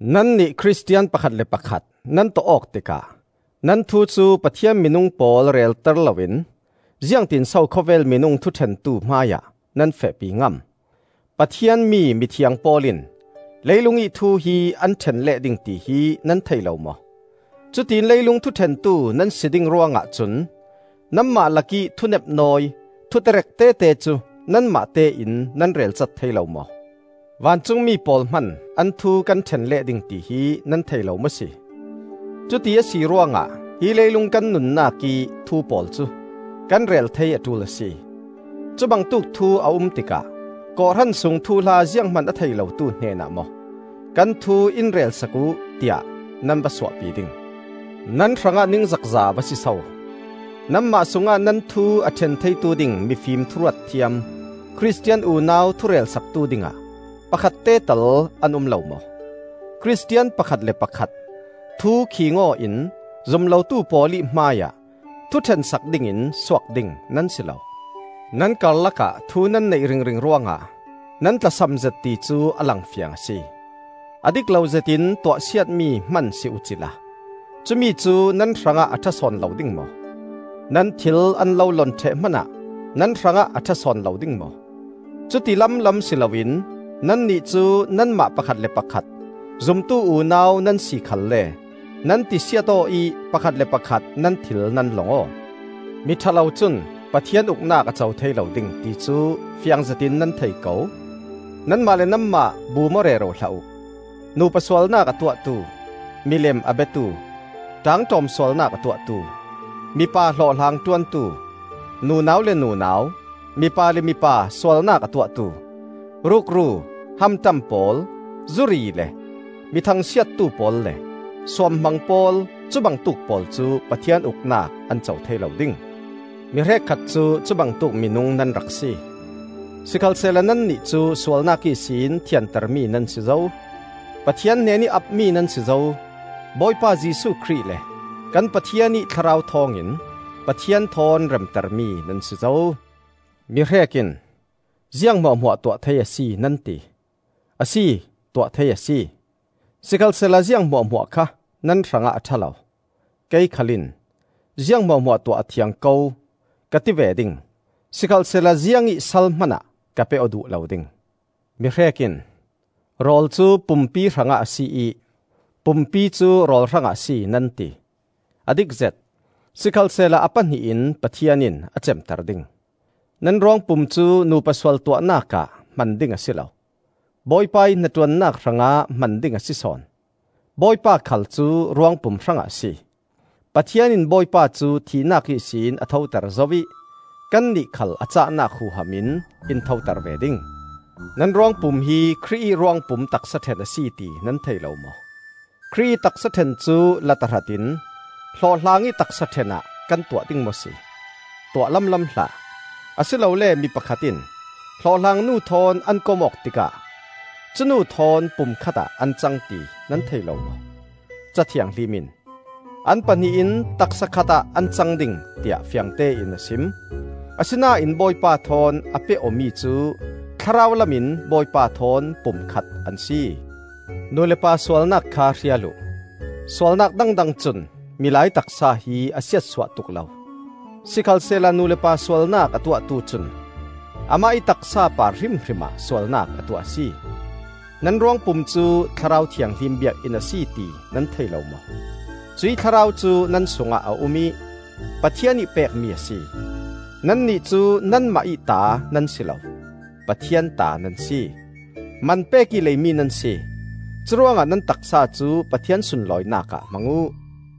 Nannih Khristian pakhat le pakhat nan tawh awk tikah nan thu cu Pathian minung pawl relter loin ziangtinso khawvel minung thuṭhentu hmaiah nan fehpi ngam? Pathian mi mithiang pawl in leilungih thu hi an ṭhen leh ding tihi nan thei lo maw? Cutiin leilung thuṭhentu nan si ding ruangah cun nanmah lakih thunepnawi, thuterek tete cu nanmahte in nan relcat thei lo maw? Vancungmi pawl hman an thu kan ṭhen leh ding tihi nan thei lo maw si? Cuti a si ruangah hi leilung kan nunnak ih thu pawl cu kan rel thei a ṭul a si. Cubangtuk thu a um tikah kawhhran sung thuhla zianghman a thei lotu hnenah maw, “Kan thu in rel sak uh,” tiah nan va suahpi ding? Nan hrangah ningzakza a va si so! Nanmah sungah nan thu a ṭhen theitu ding mifim thuruat thiam, Khristian unau thurel saktu dingah pakhatte tal an um lo maw? Khristian pakhat le pakhat thukhiing aw in zum lotu pawl ih hmaiah thuṭhen sak dingin suak ding nan si lo! Nan karlakah thu nan neih ringring ruangah nan tlasamzet ti cu a langfiang a si. A dik lo zetin tuahsiatmi hman si uh cila cumi cu nan hrangah a ṭha sawn lo ding maw? Nan thil an lo lon ṭheh hmanah nan hrangah a ṭha sawn lo ding maw? Cuti lamlam si loin nannih cu nanmah pakhat le pakhat zumtu unau nan si khalle nan tisiat aw ih pakhat le pakhat nan thil nan long aw. Miṭha lo cun Pathian Uknak a co thei lo ding, ti cu fiang zetin nan thei ko. Nanmah le nanmah bum aw rero hlah uh: nupa sualnak a tuahtu, milem a biatu, ṭaangṭawm sualnak a tuahtu, mipa hlawhhlang ṭuantu, nunau le nunau, mipa le mipa sualnak a tuahtu, rukru, hamṭam pawl, zuri le mi thangsiattu pawl le suamhmang pawl, cubangtuk pawl cu Pathian Uknak an co thei lo ding. Mi hrekkhat cu cubangtuk minung nan rak si. Sikhalsehla nannih cu sualnak ihsin thiantermi nan si zo; Pathian hnenih apmi nan si zo; Bawipa Jesuh Khrih le kan Pathian ih Thlarau thawngin Pathian thawn remtermi nan si zo. Mihrek in, “Ziang hmuahhmuah tuah thei a si,” nan ti. Asi, tuah thei a si; sikhalsehla ziang hmuahhmuah kha nan hrangah a ṭha lo. Kei khal in, “Ziang hmuahhmuah tuah a thiang ko,” ka ti ve ding; sikhalsehla ziangih sal hmanah ka pe aw duh lo ding. Mihrek in, “Rawl cu pumpi hrangah a si ih pumpi cu rawl hrangah a si,” nan ti; a dikzet. Sikhalsehla a pahnih in Pathian in a cemter ding. Nan ruangpum cu nupa sual tuahnak ah hman ding a si lo, Bawipa ih hnaṭuannak hrangah hman ding a si sawn; Bawipa khal cu ruangpum hrangah a si. Pathian in Bawipa cu thihnak ihsin a thoter zo ih kannih khal a cahnak huham in in thoter ve ding. Nan ruangpum hi Khrih ih ruangpum taksa ṭhen a si ti nan thei lo maw? Khrih ih taksa ṭhen cu la tahratin hlawhhlang ih taksa ṭhen ah kan tuah ding maw si? Tuah lamlam hlah! Asilole mi pakhat in hlawhhlangnu thawn an kom awk tikah cu nu thawn pum khatah an cang ti nan thei lo maw? Ca Thianghlim in, “An pahnih in taksa khatah an cang ding,” tiah fiangtein a sim. Asinain Bawipa thawn a peh awmi cu thlarau lamin Bawipa thawn pum khat an si. Nu le pa sualnak kha hrial uh. Sualnak dangdang cun milai taksa hi a siatsuah tuk lo; sikhalsehla nu le pa sualnak a tuahtu cun amah ih taksa par hrimhrim ah sualnak a tuah a si. Nan ruangpum cu Thlarau Thianghlim biakinn a si ti nan thei lo maw? Cuih Thlarau cu nan sungah a um ih Pathian ih pekmi a si. Nannih cu nanmah ih ta nan si lo, Pathian ta nan si. Man pek ih leimi nan si. Curuangah nan taksa cu Pathian sunlawinak ah hmang uh.